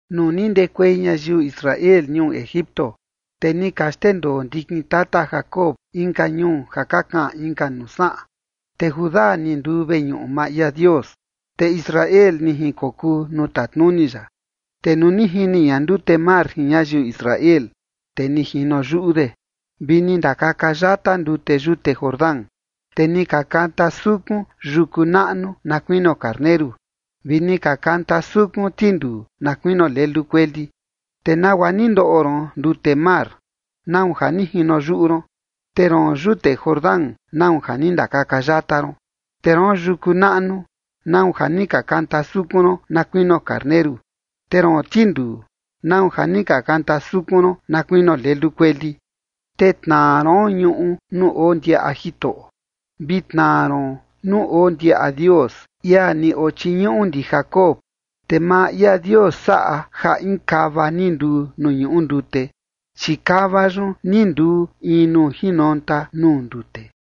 Nuu ni ndekuei ñayiu Israel ñuu Egipto, te ni ka xndendoo ndikin tata Jacob inka ñuu ja ka kaꞌan inka nuu saꞌan, te Judá ni nduu veñuꞌu maa ia Dios, te Israel ni jinkokuu nuu tatnuni ya. Te nuu ni jini ña ndute mar jin ñayiu Israel, te ni jino yuꞌu de, vi ni ndakaka yata ndute yute Jordán. Te ni ka kanta sukun yuku naꞌnu na kuinio karneru, vi ni ka kanta sukun tinduu na kuinio lelu kueli. ¿Te nagua ni ndoꞌo ron ndute mar? ¿Nau ja ni jino yuꞌu ron? Te roon yute Jordán, ¿nau ja ni ndakaka yata ron? Te roon yuku naꞌnu, ¿nau ja ni ka kanta sukun ron na kuinio karneru? Te roon tinduu, ¿nau ja ni ka kanta sukun ron na kuinio lelu kueli? Te tnaa ron ñuꞌu nuu oo ndiaꞌa Jitoꞌo, vi tnaa ron nuu oo ndiaꞌa Dios, ia ni ochiñuꞌu ndi Jacob. Te maa ia Dios saꞌa ja in kava ni nduu nuu ñuꞌu ndute, chi kava yun ni nduu in nuu jinonta nuu ndute.